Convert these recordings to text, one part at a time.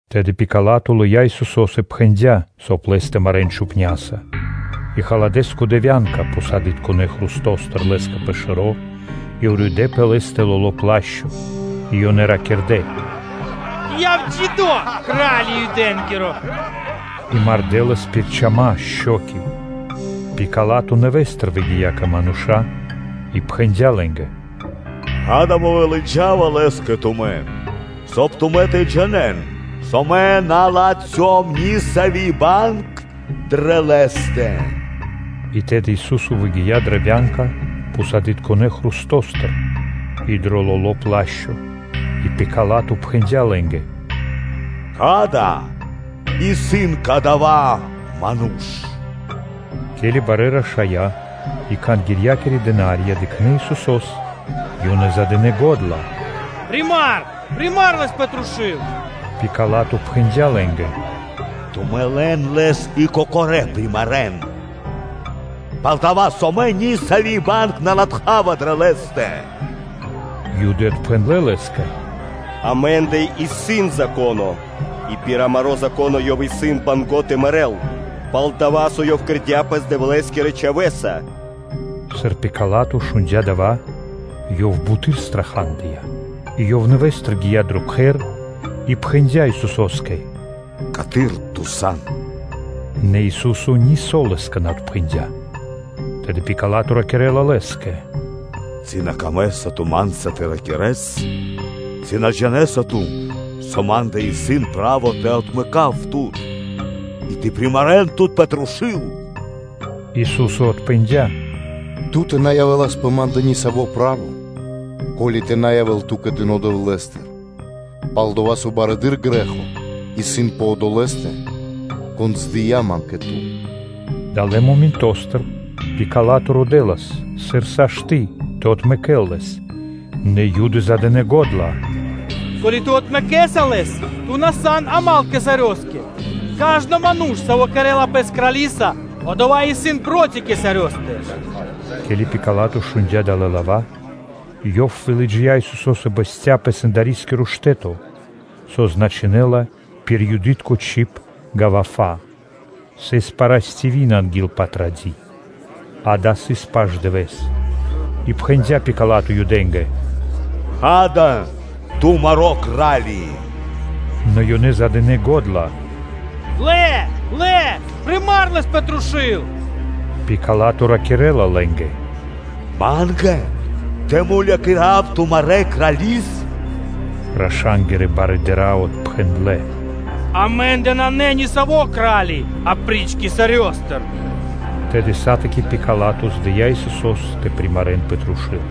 Тэды Пила́то лыя́ Исусо́с и пхэндя́, соб (кай) Лэс тэ марэ́н чупняса. И халадэ́ скхудэ вя́нка пхусадытконэ хрустостыр Лэ́скэ пэ шэро́, и уридэ́ пэ Лэ́стэ лоло́ плашчо. И ёнэ ракирдэ́: “Яв джидо́, Кра́ли Юдэ́нгиро!” – и мардэ́ Лэс пир чама (шчоки). Пила́то нэвэ́стыр выгия́ кэ мануша́ и пхэндя́ лэ́нгэ: “Ѓа́да, мэ вылыджава Лэс кэ тумэ́, соб (кай) тумэ́ тэ джинэ́н, со мэ на латхём нисави́ банг дрэ Лэ́стэ.” И тэды Ису́со выгия́ дрэ вя́нка пхусадытконэ хрустостыр и дро лоло́ плашчо. И Пила́то пхэндя́ лэ́нгэ: “Ѓа́да, исын кадава́ Ману́ш!” Ке́ли барэ́ рашая́ и Кхангирья́кирэ дына́рья дыкхнэ́ Исусо́с, ёнэ задынэ го́дла: “Примар, примар Лэс пэ трушу́л!” Пила́то пхэндя́ лэ́нгэ: “Тумэ́ лэн Лэс и кокорэ́ примарэн, пал-дова́ со мэ нисави́ банг на латхава дрэ Лэ́стэ.” Юды отпхэндлэ́ лэ́скэ: “Амэ́ндэ исын Зако́но, и пир амаро́ Зако́но Ёв исын банго́ тэ мэрэ́л, пал-дова́ со Ёв кэрдя́ Пэс Дэвлэ́скирэ Чхавэ́са.” Сыр Пила́то шундя́ дава́, ёв буты́р страхадыя, и ёв нэвэ́стыр гия́ дро сэндарискиро кхэр, и пхэндя́ Исусо́скэ: “Каты́р Ту сан?” Нэ Ису́со нисо́ лэ́скэ на отпхэндя́. Тэды Пила́то ракирэ́ла Лэ́скэ: “Ци на камэ́са Ту ма́нца тэ ракирэ́с? Ци на джинэ́са Ту, со ма́ндэ исын право тэ отмэкав Тут, и тэ примарэн Тут пэ трушу́л?” Ису́со отпхэндя́. “Ту́тэ на явэ́лас пэ Ма́ндэ ни саво́ право, ко́ли (со) тэ на явэ́л ту́кэ дыно́ Дэвлэ́стыр. Пал-дова́ со барэды́р грэ́хо исын пэ одолэ́стэ, кон здыя Ман кэ ту.” Далэ́ моментостыр Пила́то родэлас, сыр сашты́ тэ отмэкэ́л Лэс, нэ Юды задынэ го́дла: “Ко́ли (со) ту отмэкэса Лэс, ту на сан дру́го (мал) Кесарёскэ. Кажно ману́ш, саво́ кэрэ́ла пэс крали́са, одова́ исын проти Кесарёстэ.” Ке́ли Пила́то шундя́ далэ́ лава́, ёв вылыджия́ Исусо́с и бэсця́ пэ сэндарискиро штэ́то, со значынэ́ла пир юды́тко чиб “ґавафа”; сыс парастиви́н (пятница) анги́л Патради́, дава́ сыс пашдывэс. И пхэндя́ Пила́то Юдэ́нгэ: “Ѓа́да, тумаро́ Кра́ли исын!” Нэ ёнэ задынэ го́дла: “Лэ, лэ, примар Лэс пэ трушу́л!” Пила́то ракирэ́ла лэ́нгэ: “Ма́нгэ тэ мулякирав тумарэ́ Крали́с?” Раша́нгирэ барыдыра́ отпхэндлэ́: “Амэ́ндэ нанэ нисаво́ Кра́ли апри́ч Кесарёстэ.” Тэды сатаки Пила́то здыя Исусо́с тэ примарэн пэ трушу́л.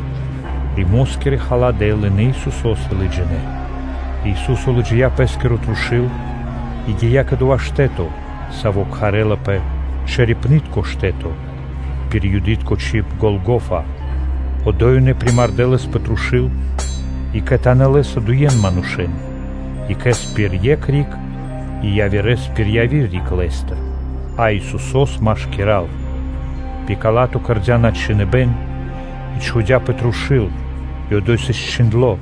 Римо́скирэ халадэ́ лынэ́ Исусо́с и лыджинэ́, и Ису́со лыджия́ Пэ́скиро трушу́л и гия́ кэ дова́ штэ́то, саво́ кхарэ́лапэ “Чэрепнытко штэ́то”, пир юды́тко чиб “Голгофа”; Одо́й ёнэ примардэ Лэс пэ трушу́л, и кхэтанэ́ Лэ́са дуе манушэ́н, екхэ́с пир екх риг и явирэ́с пир яви́р риг Лэ́стыр, а Исусо́с машкира́л. Пила́то кэрдя́ подчхиныбэн и чхудя́ пэ трушу́л и одо́й сыс чхиндло́: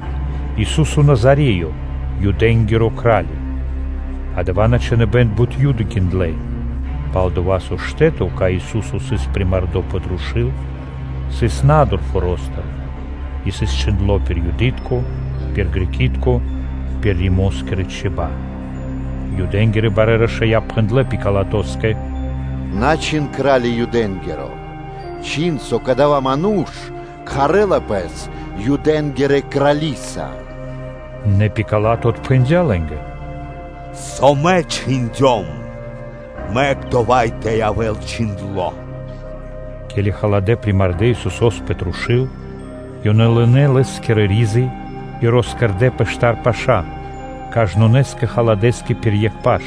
“Ису́со Назареё, Юдэ́нгиро Кра́ли.” Адава́ надчхиныбэн бут Юды гиндлэ́, пал-дова́ со штэ́то, кай Ису́со сыс примардо пэ трушу́л, сыс на́дур форо́стыр, и сыс чхиндло́ пир юды́тко, пир греки́тко (балами́тко), пир римо́скирэ чиба́ (чибья́). Юдэ́нгирэ барэ́ рашая́ пхэндлэ́ Пилатоскэ: “На чхин ‘Кра́ли Юдэ́нгиро,’ чхин, со кадава́ Ману́ш кхарэлас Пэс ‘Юдэ́нгирэ Крали́са.’ Нэ Пила́то отпхэндя́ лэ́нгэ: “Со мэ чхиндём, мэк дова́ тэ явэ́л чхиндло́.” Ке́ли халадэ́ примардэ Исусо́с пэ трушу́л, ёнэ лынэ́ Лэ́скирэ ризы и росчхудэ пэ штар паша́, кажнонэ́скэ халадэскэ пир екх паш;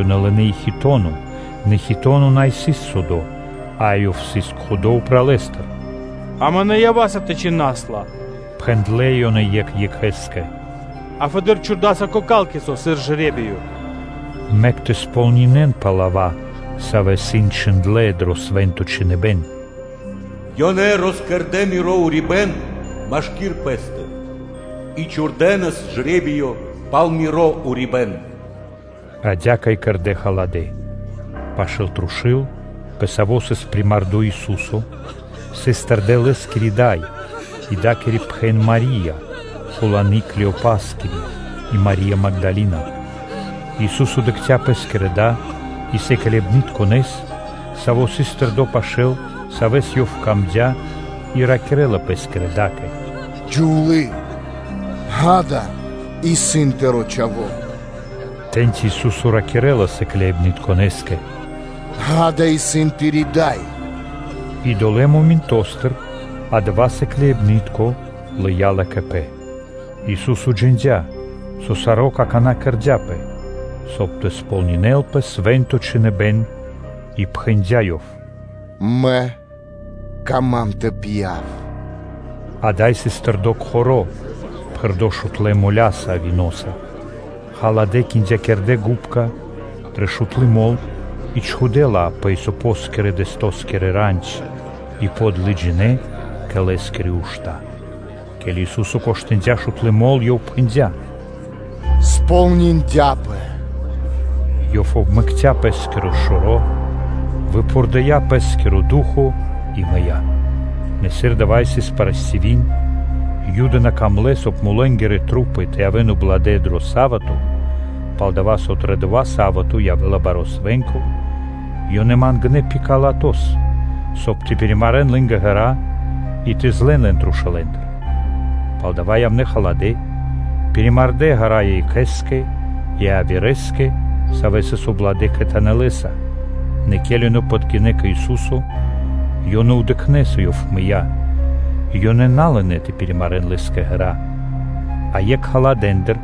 ёнэ лынэ́ и хитоно, нэ хитоно на сыс судо, а ёв сыс кхудо упралэстыр. “Амэ на ява́са тэ кушас лэс, – пхэндлэ́ ёнэ екх екхэ́скэ, – а фэды́р чхурдаса кокалкицо, сыр жре́биё.” Мэк тэ сполнинэнпэ лава́, савэ́ исын чхиндлэ́ дро Свэ́нто Чхиныбэ́н: “Ёнэ роскэрдэ Мирэ́ ризы машки́р пэ́стэ и чхурдэнас жре́биё и пал Миро урибэ́н.” Адя́кэ и кэрдэ́ халадэ́. Пашы́л трушу́л, пэ саво́ сыс примардо Ису́со, сыс тэрдэ́ Лэ́скири дай, и дакири пхэн Мари́я, хуланы Клеопаскири, и Мари́я Магдалина. Ису́со дыкця Пэскирья́ да и сыкляибнытконэс, саво́ сыс тэрдо́ пашы́л, саво́ сыс дро́го Лэ́скэ, и ракирэ́ла Пэ́скирэ да́кэ: “Дро́го Джувлие! Ѓа́да, исын тыро́ чхаво́.” Тэ́ньци Ису́со ракирэ́ла сыкляибнытконэскэ: “Ѓа́да, исын тыри́ дай!” И одолэ́ моментостыр адава́ сыкляибны́тко лыя́ ла кэ пэ. Ису́со джиндя́, со саро́ какана́ кэрдя́пэ, соб (кай) тэ кэрэ́лпэ саро́ пир Свэ́нто Чхиныбэ́н, и пхэндя́ Ёв: “Мэ кама́м тэ пья́в.” Ада́й сыс тэрдо́ кхоро́ (жбано), пхэрдо́ шутлэ моляса (виноса). Халадэ́ киндякирдэ губка дрэ шутлы мол и чхудэ́ ла пэ исопоскирэ – дэстоскири рандь, и подлыджинэ кэ Лэ́скирэ ушта́. Ке́ли Ису́со коштындя шутлы мол, Ёв пхэндя́: “Кэрдя́пэ!” Ёв обмэкця Пэ́скиро шэро́, выпхурдыя Пэ́скиро ду́хо (фа́но) и мыя́. Нэ сыр дава́ сыс парастиви́н (пятница), и Юды на камлэ́, соб (кай) тру́пы тэ явэ́н убладэ дро са́вато (субо́та), палдава́ со дро дова́ Са́вато сыс баро́ свэ́нко, ёнэ мангнэ́ Пилатос, соб (кай) тэ пиримарэн лэ́нгэ ґэра́ и тэ злэн лэн трушулэндыр. Палдава́ явнэ́ халадэ́, пиримардэ ґэра́ екхэ́скэ и явирэскэ, савэ́ сыс убладэ кхэтанэ́ Лэ́са; нэ ке́ли ёнэ подгинэ́ кэ Ису́со, ёнэ дыкхнэ́, со Ёв мыя́, и ёнэ на лынэ́ тэ пиримарэн Лэ́скэ ґэра́, а екх халадэндыр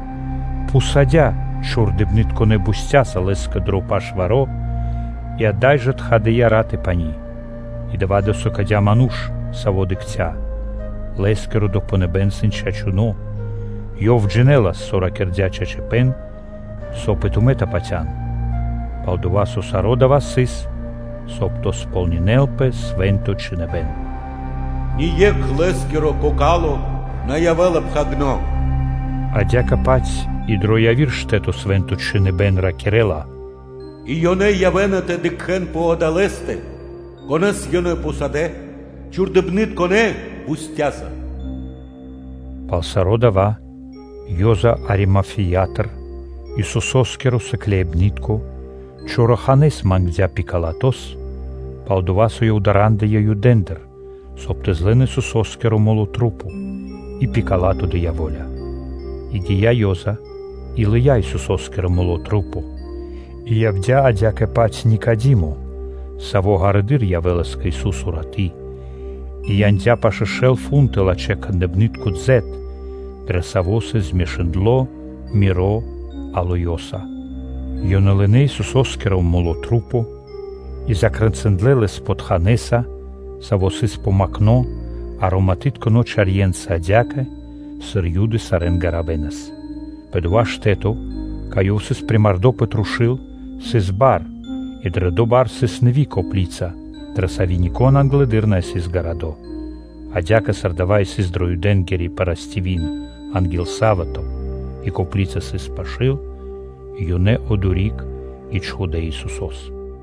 пхусадя чхурдыпнытконэ бустяса (коп΄ёса) Лэ́скэ дро пашваро, и ада́й жэ тхадыя рат и пани́. И дава́ досыкадя ману́ш, саво́ дыкхця́, лэ́скиро допхэныбэ́н исын чачуно́; ёв джинэлас, со ракирдя́ чачипэ́н, соб (кай) и тумэ́ тэ патя́н. Пал-дова́ со саро́ дава́ сыс, соб (кай) тэ сполнинэ́лпэ Свэ́нто Чхиныбэ́н: “Ни екх Лэ́скиро кокало на явэ́ла пхагирдо́. Адя́кэ-паць и дро яви́р штэ́то Свэ́нто Чхиныбэ́н ракирэ́ла: “И ёнэ явэ́на тэ дыкхэ́н пэ Одолэ́стэ, Конэ́с ёнэ пхусадэ́ чхурдыбнытконэ бустяса.” Пало́ саро́ дава́ Ёза Аримафеятыр, Исусо́скиро сыкляибны́тко, чораханэ́с мангдя́ Пилатос, пал-дова́ со ёв дарандыя Юдэндыр, соб (кай) тэ злэн Исусо́скиро тру́по: и Пила́то дыя́ во́ля. И гия́ Ёза и лыя́ Исусо́скиро тру́по. И явдя́ адя́кэ-паць Никадимо, саво́ ґарэдыр явэ́лас кэ Ису́со раты́, и яндя́ пашэ́ шэл фунты лачхэ́-кхандыпнытко составо (дзэт), дро саво́ сыс змешындло миро алоёса. Ёнэ лынэ́ Исусо́скиро тру́по и закрэнциндлэ Лэс потханэса, саво́ сыс помакхно ароматытконэ чарьенца адя́кэ, сыр Юды сарэ́н гаравэнас. Пэ дова́ штэ́то, кай Ёв сыс примардо пэ трушу́л, сыс у́нта (садо), и дрэ доя́ у́нта сыс нэви́ копли́ца, дрэ сави́ нико́н англэды́р на сыс гарадо́. Адя́кэ, сыр дава́ сыс дрэ Юдэнгири парастиви́н анги́л Са́вато и копли́ца сыс пашы́л, ёнэ одори́к и чхудэ́ Исусо́с.